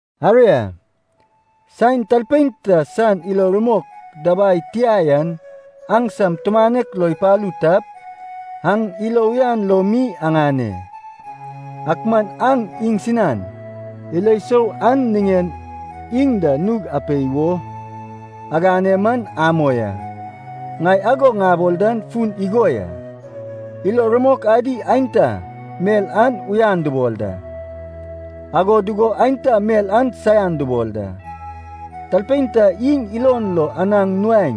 Aria, saen talpein ta san ilo rumok dabai tia yan aŋsam tumanek lo ipalu tap, aŋ ilo uyan lo mi aŋane. Ak man aŋ iŋsinan ilo sou an niŋen iŋ da nug apei wo agane man amoi a. Ŋai ago ŋabol dan fun igo ya. Ilo rumok adi aenta mel an uyan dubol da, ago dugo aenta mel an saian dubol da. Talpein ta iŋ ilon lo anaŋ nuaeŋ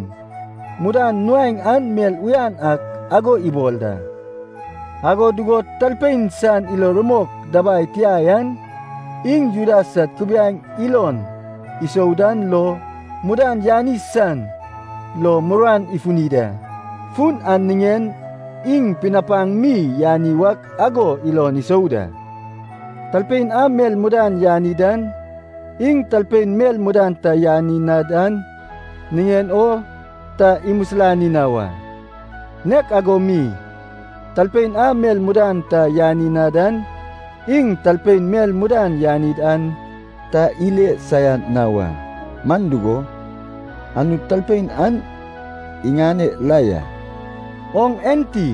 mudan nuaeŋ an mel uyan ak ago ibol da. Ago dugo talpein san ilo rumok dabai tia yan, iŋ Juda sad kubiaeŋ ilon isou dan lo mudan yani san lo muruan ifuni da. Fun an niŋen iŋ pinapaŋ mi yani wak ago ilon isou da. Talpein a mel mudan yani dan iŋ talpein mel mudan ta yani na dan niŋen o ta imisilani na wa. Nek ago mi talpein a mel mudan ta yani na dan iŋ talpein mel mudan yani dan ta ile saian na wa. Man dugo, Anut talpein an iŋane la ya. Oŋ enti,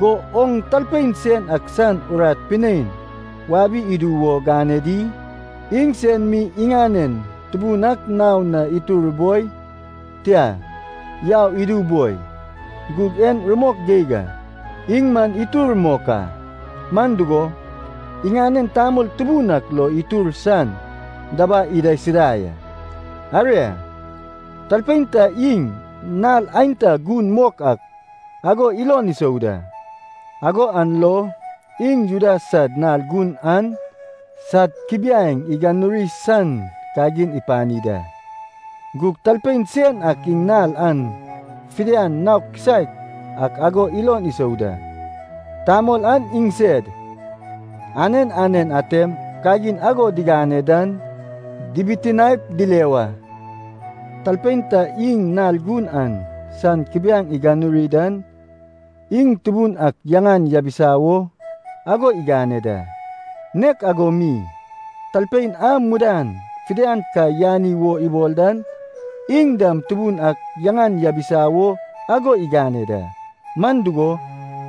go oŋ talpein sen ak san urat pinein wabi idu wo gane di? Iŋsen mi iŋanen tubun ak naon na itur boi, tia, yau idu boi. Gug en rumok geig a, iŋ man itur mok a. Man dugo, iŋanen tamol tubun ak lo itur san dabai idaisida ya. Aria, talpein ta iŋ nal aenta gun mok ak ago ilon isou da, ago yan lo iŋ Juda sad nal gun an sad kubiaeŋ iganuri san kagin ipani da. Gug talpein sen ak iŋ nal an fidian naon kisaek ak ago ilon isou da. Tamol an iŋsed anen anen atem kagin ago digane dan dibitinaep dile wa. Talpein ta iŋ nal gun an san kubiaeŋ iganuri dan, iŋ Tubun ak yaŋan yabisa wo ago igane da. Nek ago mi talpein a mudan fidian ka yani wo ibol dan, iŋ dam Tubun ak yaŋan yabisa wo ago igane da. Man dugo,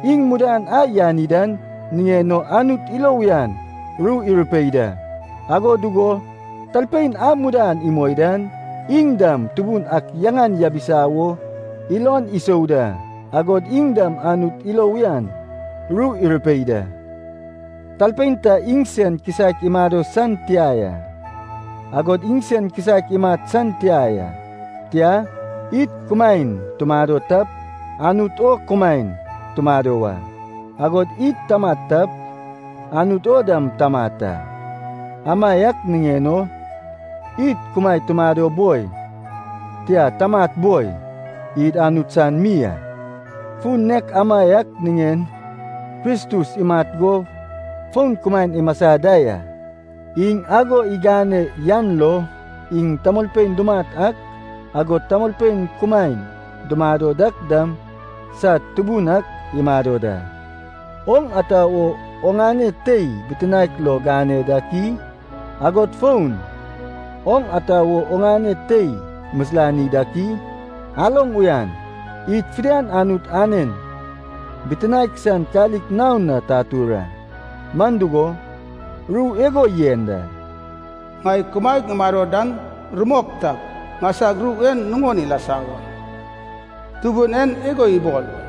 iŋ mudan a yani dan niŋen o Anut ilo uyan ru irupei da. Ago dugo talpein a mudan imoi dan, iŋ dam Tubun ak yaŋan yabisa wo ilon isou da. Agod iŋ dam Anut ilo uyan ru irupei da. Talpein ta iŋsen kisaek imado san tia ya. Agod iŋsen kisaek imat san tia ya. Tia, id kumaen tumado tap, Anut o kumaen tumado wa. Agod id tamat tap, Anut o dam tamat a. Amaiak niŋen o, id kumaen tumado boi, tia tamat boi, id Anut san mi a. Fun nek amaiak niŋen Kristus imat go fon kumaen imasa da ya. Iŋ ago igane yan lo iŋ tamolpein dumat ak, agod tamolpein kumaen dumado dak dam sad Tubun ak imado da. Oŋ ata wo oŋane tei bitinaek lo gane dak i? Agod fon, oŋ ata wo oŋane tei misilani dak i? Aloŋ uyan, id fidian Anut anen bitinaek san kalik naon na tatur a. Man dugo, ru igo yen da, “Ŋai kumaeg ŋumado dan rumok tap, ŋaisag ru en nuŋon ilasa wa. Tubun en igo ibol da.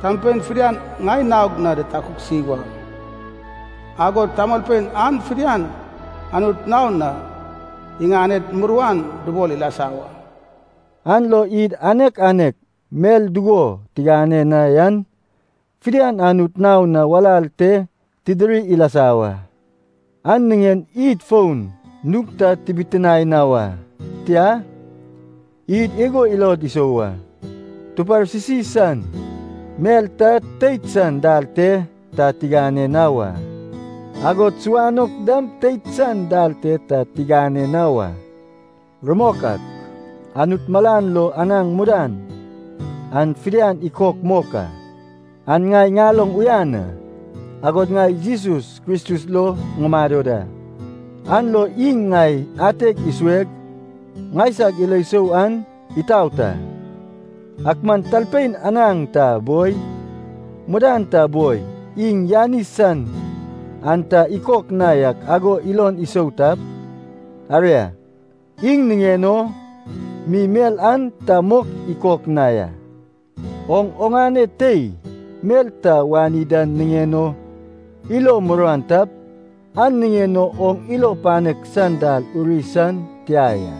Tamolpein fidian ŋai naog na ditakoksi wa. Agod tamolpein an fidian Anut naon na iŋaned muruan dubol ilasa wa.” An lo id anek anek mel dugo tigane na yan fidian Anut naon na walal te tidiri ilasa wa. An niŋen id fon nug ta tibitinae na wa. Tia, id igo ilod isou wa, tuparsisi san mel ta teid san dal te ta tigane na wa, agod suwanok dam teid san dal te ta tigane na wa. Rumok ak, Anut malan lo anaŋ mudan an fidian ikok mok a. An ŋai ŋaloŋ uyan a, agod ŋai Jesus Kristus lo ŋumado da, an lo iŋ ŋai ateg isueg ŋaisag ilo sou an itaot a. Ak man talpein anaŋ ta boi, mudan ta boi iŋ yani san an ta ikok na yak ago ilon isou tap, aria iŋ niŋen o mi mel an ta mok ikok na ya. Oŋ oŋane tei mel ta wani dan niŋen o ilon muruan tap, an niŋen o oŋ ilo panek san dal uri san tia ya.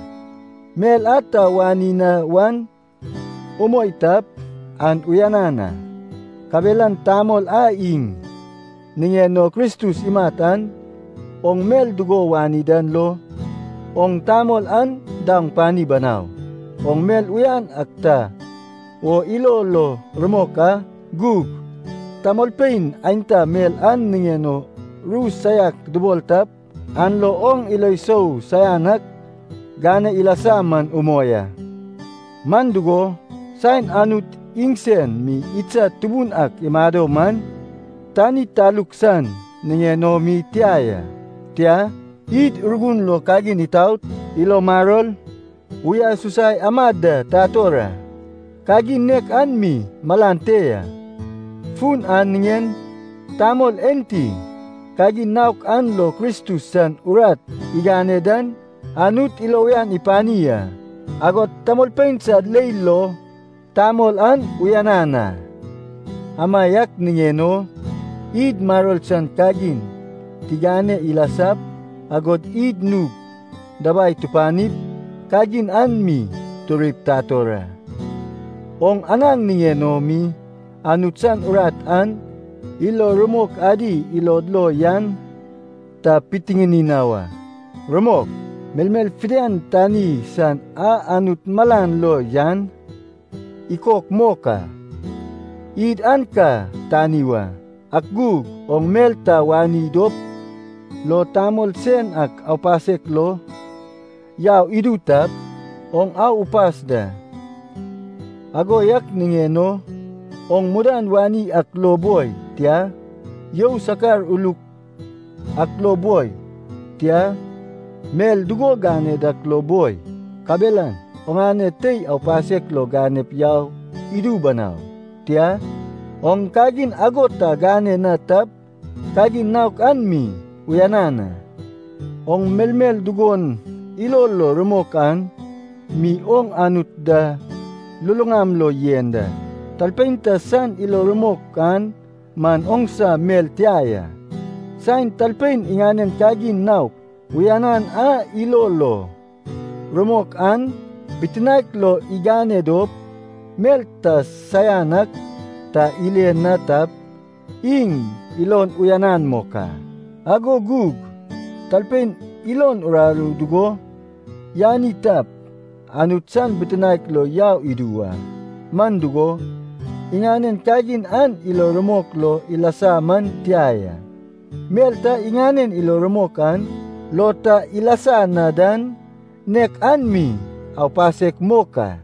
Mel a ta wani na wan umoi tap, an uyanan a. Kabelan tamol a iŋ niŋen o Kristus imat an, oŋ mel dugo wani dan lo, oŋ tamol an daoŋ pani banau. Oŋ mel uyan ak ta wo ilo lo rumok a, gug tamolpein aenta mel an niŋen o ru saiak dubol tap, an lo oŋ ilo sou saian ak gane ilasa man umoi a. Man dugo, saen Anut iŋsen mi idsad Tubun ak imado man, tani taluk san niŋen o mi tia ya. Tia, id Urgun lo kagin itaot, ilo maror, uyasusai amad da tator a. Kagin nek an mi malan te ya. Fun an niŋen tamol enti kagin naok an lo Kristus san urat igane dan Anut ilo uyan ipani a. Agod tamolpein sad leil lo tamol an uyanan a. Amaiak niŋen o, id maror san kagin tigane ilasap, agod id nug dabai tupanip, kagin an mi turip tator a. Oŋ anaŋ niŋen o mi, Anut san urat an, ilo rumok adi ilod lo yan ta pitiŋini na wa. Rumok, melmel fidian tani san a Anut malan lo yan ikok mok a, id an ka tani wa. Ak gug oŋ mel ta wani dop lo tamol sen ak aupasek lo yau idu tap, oŋ au upas da. Ago yak niŋen o, oŋ mudan wani ak lo boi, tia, you sakar uluk ak lo boi, tia, mel dugo gane dak lo boi, kabelan oŋane tei aupasek lo ganep yau idu banau. Tia, oŋ kagin ago ta gane na tap, kagin naok an mi uyanan a. Oŋ melmel dugon ilo lo rumok an mi oŋ Anut da luluŋam lo yen da. Talpein ta san ilo rumok an man oŋsa mel tia ya. Saen talpein iŋanen kagin naok uyanan a ilo lo rumok an bitinaek lo igane dop, mel ta saian ak ta ile na tap, iŋ ilon uyanan mok a. Ago gug, talpein ilon uraru dugo yani tap, Anut san bitinaek lo yau idu wa. Man dugo, iŋanen kagin an ilo rumok lo ilasa man tia ya. Mel ta iŋanen ilo rumok an lo ta ilasa na dan, nek an mi aupasek mok a.